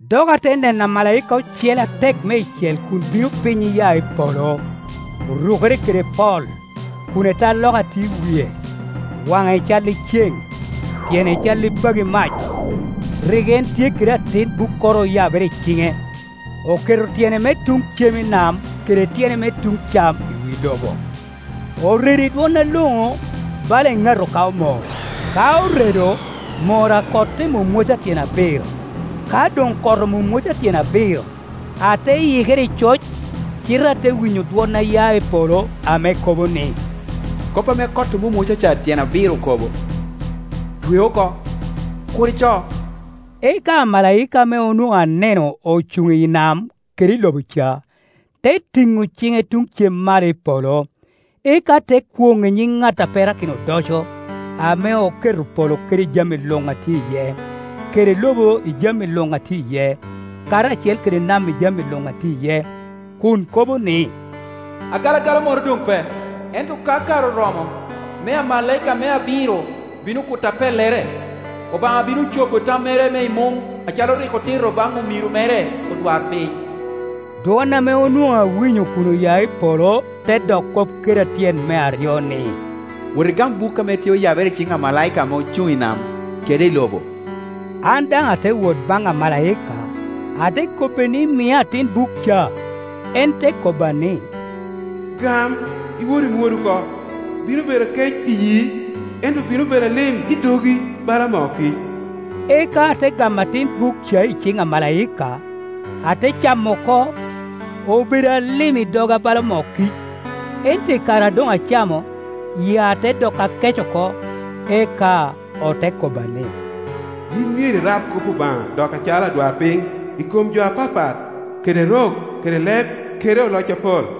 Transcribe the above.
Dok ate neno amalaika ocele atek meicel kun bino piny iya i polo. Orukere kede pol, kun etaloka tye i wie, waŋe cal i ceŋ, tyene cal i pagi mac. Rik en tye kede atin bukkoro oyabere i ciŋe. Oketo tyene me tuŋ cem i nam kede tyene me tuŋ cam i wi lobo. Oredo i dwon aloŋo bala eŋato ka omor; ka oredo, mor a kot te mwomwoca tyen abiro. Ka doŋ kot omwomwoca tyen abiro, ate yikere i coc, cite ate winyo dwon a ya i polo ame kobo ni, “Kop ame kot omwomwoca tyen abiro okobo, twe oko, kur ico,” Eka amalaika ame onwoŋo aneno ocuŋ i nam kede i lobo ca, te tiŋo ciŋe tuŋ cem malo i polo, eka te kwoŋ i nyiŋ ŋat a perakino odoco, ame oketo polo kede jami luŋ a tye iye, kede lobo i jami luŋ a tye iye karacel kede nam i jami luŋ a tye iye, kun kobo ni, “Agalagala moro doŋ pe, ento ka kare oromo me amalaika me abiro bino kuto apellere, Obaŋa bino cobo tammere me i muŋ acalo rik otito baŋ omiro mere odwarpiny.” Dwon ame onwoŋo awinyo kun oya i polo te dok kop keda tyen me aryo ni, “Wot igam buk ame tye oyabere i ciŋ amalaika ame ocuŋ i nam kede i lobo.” An daŋ ate wot baŋ amalaika, ate kobbe ni mia atin buk ca. En te kobba ni, “Gam, iwot imwod oko. Bino bedo akec iyii, ento bino bedo alim i dogi bala moo kic.” Eka ate gamo atin buk ca i ciŋ amalaika, ate camo oko. Obedo alim i doga bala moo kic, ento i kare a doŋ acamo, yia te doko akec oko. Eka ote kobba ni, “Yin myero irab kop Obaŋa doki acalo adwarpiny, i kom jo apapat kede rok kede leb kede oloc apol.”